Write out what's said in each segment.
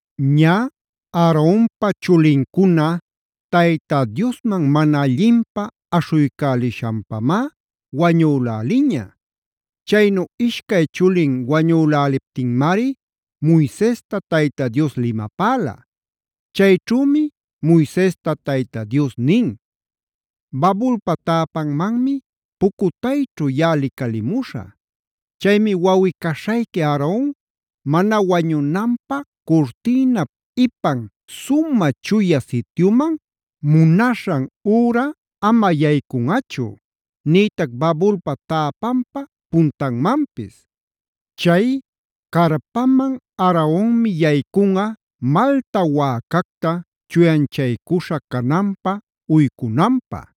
Ñä Aaronpa chulincuna Tayta Diosman mana allinpä aśhuycälishanpamá wañulälilaña. Chaynu ishcay chulin wañüläliptinmari Moisesta Tayta Dios limapäla. Chayćhümi Moisesta Tayta Dios nin: “Babulpa täpanmanmi pucutayćhu yaꞌa licalicamuśhä. Chaymi wawꞌi-caśhayqui Aaron mana wañunanpä curtïnap ipan Sumä Chuya Sityumana munaśhan üra ama yaycunꞌachu, nïtac babulpa täpanpa puntanmanpis. Chay carpaman Aaronmi yaycunꞌa malta wäcacta chuyanchaycuśha cananpa uycunanpä;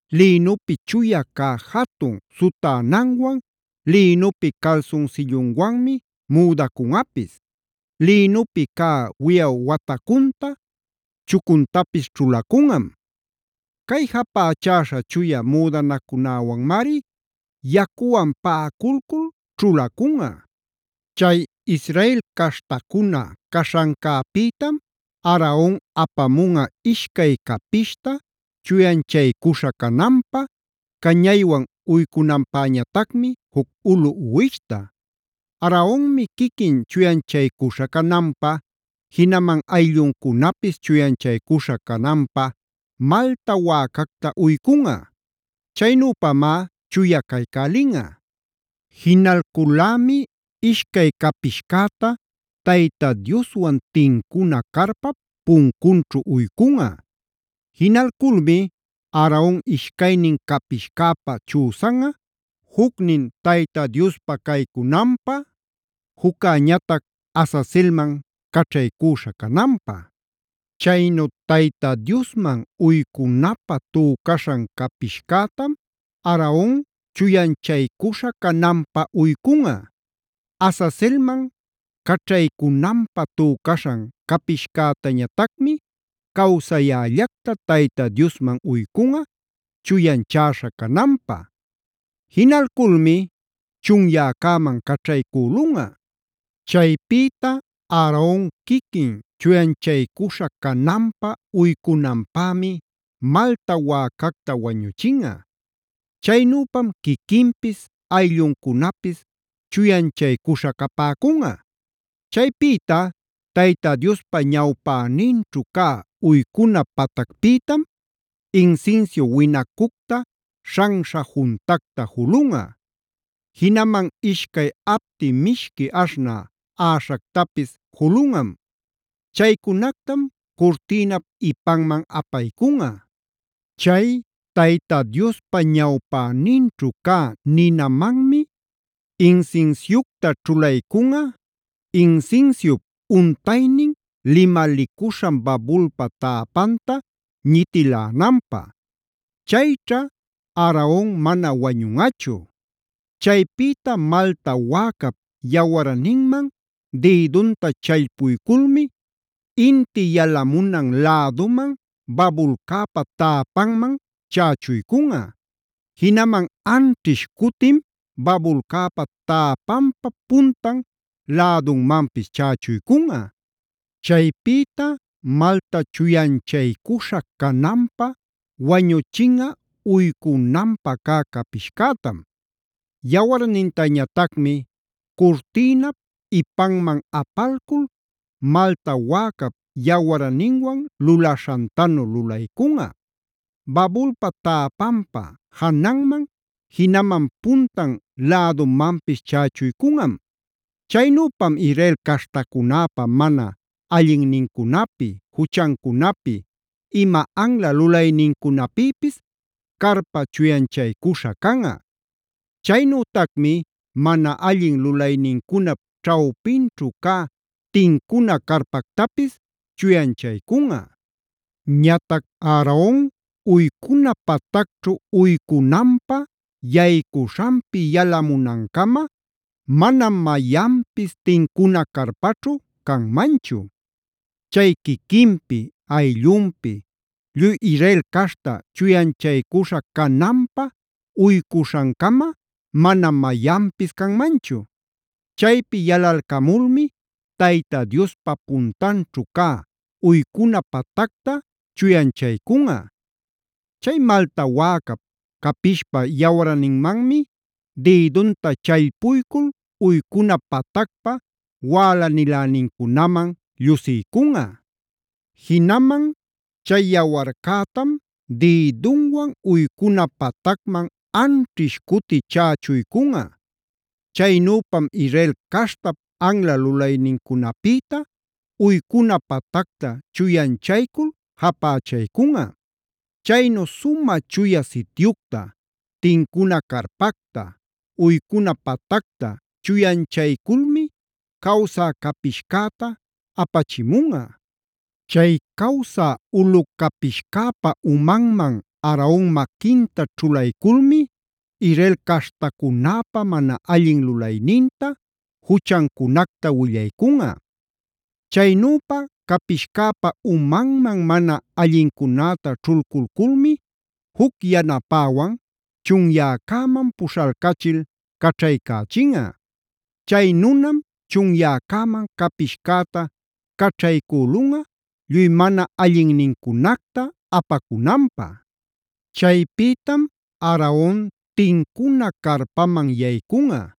Lïnupi chuya cä jatun sutänanwan, lïnupi calsunsillunwanmi müdacunꞌapis; lïnupi cä wiyaw watacunta, chucuntapis ćhulacunꞌam. Cay japächäśha chuya müdanacunäwanmari yacuwan paꞌaculcul ćhulacunꞌa. “Chay Israel caśhtacuna caśhancäpïtam Aaron apamunꞌa ishcay capishta chuyanchaycuśha cananpä, cañaywan uycunanpäñatacmi juc ulu uwishta. Aaronmi quiquin chuyanchaycuśha cananpä, jinaman aylluncunapis chuyanchaycuśha cananpä malta wäcacta uycunꞌa. Chaynüpamá chuya caycälinꞌa. Jinalcul-lämi ishcay capishcäta Tayta Dioswan tincuna carpap puncunćhu uycunꞌa. Jinalculmi Aaron ishcaynin capishcäpa chüsanꞌa, jucnin Tayta Diospa caycunanpä, juccäñatac Azazelmanc caćhaycüśha cananpä. Chaynu Tayta Diosman uycunapä tücaśhan capishcätam Aaron chuyanchaycuśha cananpä uycunꞌa. Azazelman caćhaycunanpä tücaśhan capishcätañatacmi cawsayällacta Tayta Diosman uycunꞌa chuyanchäśha cananpä. Jinalculmi chunyäcäman caćhaycülunꞌa. “Chaypïta Aaron quiquin chuyanchaycuśha cananpä uycunanpämi malta wäcacta wañuchinꞌa. Chaynüpam quiquinpis, aylluncunapis chuyanchaycuśha capäcunꞌa. Chaypïta Tayta Diospa ñawpäninćhu cä uycuna patacpïtam insinsiu winacucta śhanśha juntacta julunꞌa. Jinaman ishcay apti mishqui aśhnä aꞌaśhactapis julunꞌa. Chaycunactam curtïnap ipanman apaycunꞌa. Chay Tayta Diospa ñawpäninćhu cä ninamanmi insinsiucta ćhulaycunꞌa, insinsiup untaynin limalicuśhan babulpa täpanta ñitilänanpä. Chayćha Aaron mana wañunꞌachu. Chaypïta malta wäcap yawarninman dïdunta challpuyculmi inti yalamunan läduman babulcäpa täpanman chächuycunꞌa. Jinaman anćhish cutim babulcäpa täpanpa puntan lädumanpis chächuycunꞌa. Chaypïta malca chuyanchaycuśha cananpä wañuchinꞌa uycunanpä cä capishcätam. Yawarnintañatacmi curtïnap ipanman apalculd malta wäcap yawarninwan lulaśhantanu lulaycunꞌa; babulpa täpanpa jananman jinaman puntan lädumanpis chächuycunꞌam. Chaynüpam Israel caśhtacunäpa mana allinnincunapi, juchancunapi, ima anla lulaynincunapïpis carpa chuyanchaycuśha canꞌa. Chaynütacmi mana allin lulaynincunap ćhawpinćhu cä tincuna carpactapis chuyanchaycunꞌa. “Ñatac Aaron uycuna patacćhu uycunanpä yaycuśhanpi yalamunancama manam mayanpis tincuna carpaćhu canmanchu. Chay quiquinpi, ayllunpi, lluy Israel caśhta chuyanchaycuśha cananpä uycuśhancama manam mayanpis canmanchu. Chaypi yalalcamulmi Tayta Diospa puntanćhu cä uycuna patacta chuyanchaycunꞌa. Chay malta wäcap, capishpa yawarninmanmi dïdunta challpuycul uycuna patacpa wälanilänincunaman llusiycunꞌa. Jinaman chay yawarcätam dïdunwan uycuna patacman anćhish cuti chächuycunꞌa. Chaynüpam Israel caśhtap anla lulaynincunapïta uycuna patacta chuyanchaycul japächaycunꞌa. “Chaynu Sumä Chuya Sityucta, tincuna carpacta, uycuna patacta chuyanchayculmi cawsä capishcäta apachimunꞌa. Chay cawsä ulu capishcäpa umanman Aaron maquinta ćhulayculmi Israel caśhtacunäpä mana allin lulayninta, juchancunacta willaycunꞌa. Chaynüpa capishcäpa umanman mana allincunäta ćhulculculmi juc yanapäwan chunyäcäman puśhalcachil caćhaycächinꞌa. Chay nunam chunyäcäman capishcäta caćhaycülunꞌa lluy mana allinnincunacta apacunanpä. Chaypïtam Aaron tincuna carpaman yaycunꞌa;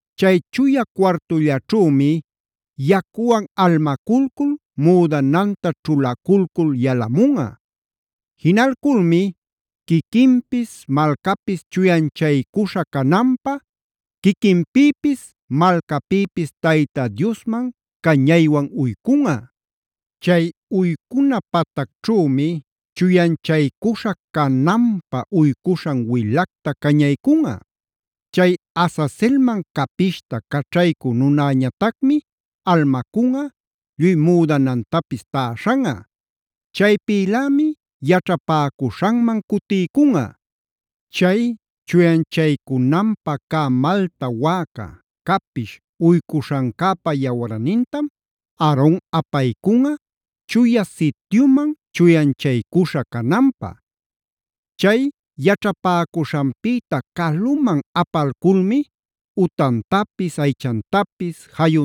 Chay chuya cuartullaćhümi yacuwan almaculcul müdananta ćhulaculcul yalamunꞌa. Jinalculmi quiquinpis, malcapis chuyanchaycuśha cananpä quiquinpïpis malcapïpis Tayta Diosman cañaywan uycunꞌa. Chay uycuna patacćhümi chuyanchaycuśha cananpä uycuśhan wilacta cañaycunꞌa. Chay Azazelman capishta caćhaycü nunäñatacmi almacunꞌa, lluy müdanantapis täśhanꞌa. Chaypïlämi yaćhapäcuśhanman cutiycunꞌa. “Chay chuyanchaycunanpä cä malta wäca, capish uycuśhancäpa yawarnintam Aaron apaycunꞌa Chuya Sityuman chuyanchaycuśha cananpä. Chay yaćhapäcuśhanpïta caluman apalculmi utantapis, aychantapis,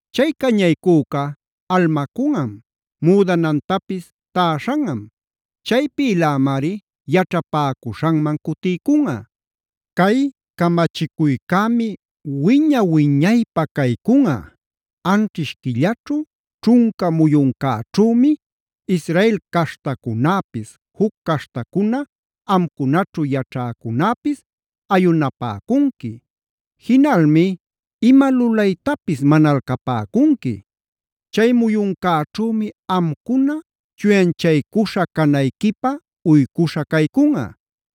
Chay cañaycüca almacunꞌam, müdanantapis täśhanꞌam. Chaypïlämari yaćhapäcuśhanman cutiycunꞌa. “Cay camachicuycämi wiña-wiñaypä caycunꞌa: anćhish quillaćhu, ćhunca muyuncäćhümi Israel caśhtacunäpis, juc caśhtacuna amcunaćhu yaćhäcunäpis ayunapäcunqui; jinalmi ima lulaytapis manalcapäcunqui. Chay muyuncäćhümi amcuna chuyanchaycuśha canayquipä uycuśha caycunꞌa.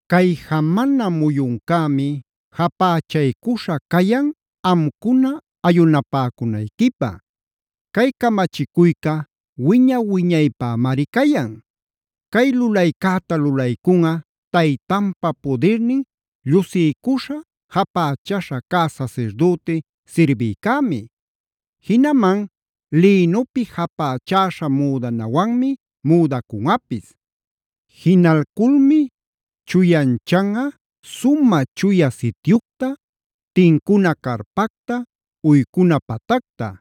Cay jamana muyuncämi japächaycuśha cayan amcuna ayunapäcunayquipä; cay camachicuyca wiña-wiñaypämari cayan. Cay lulaycäta lulaycunꞌa taytanpa pudirnin llusiycuśha, japächäśha cä sasirdüti sirbïcämi; jinaman lïnupi japächäśha müdanawanmi müdacunꞌapis. Jinalculmi chuyanchanꞌa Sumä Chuya Sityucta, tincuna carpacta, uycuna patacta.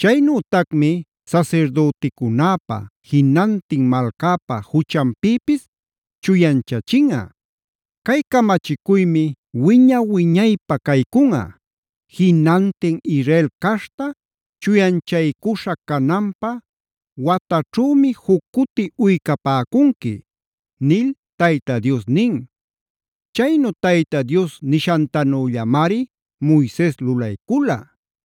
Chaynütacmi sasirdüticunäpä, jinantin malcäpä juchanpïpis chuyanchachinꞌa. “Cay camachicuymi wiña-wiñaypä caycunꞌa: Jinantin Israel caśhta chuyanchaycuśha cananpä wataćhümi juc cuti uycapäcunqui” nil Tayta Dios nin. Chaynu Tayta Dios nishantanüllamari Moises lulaycula.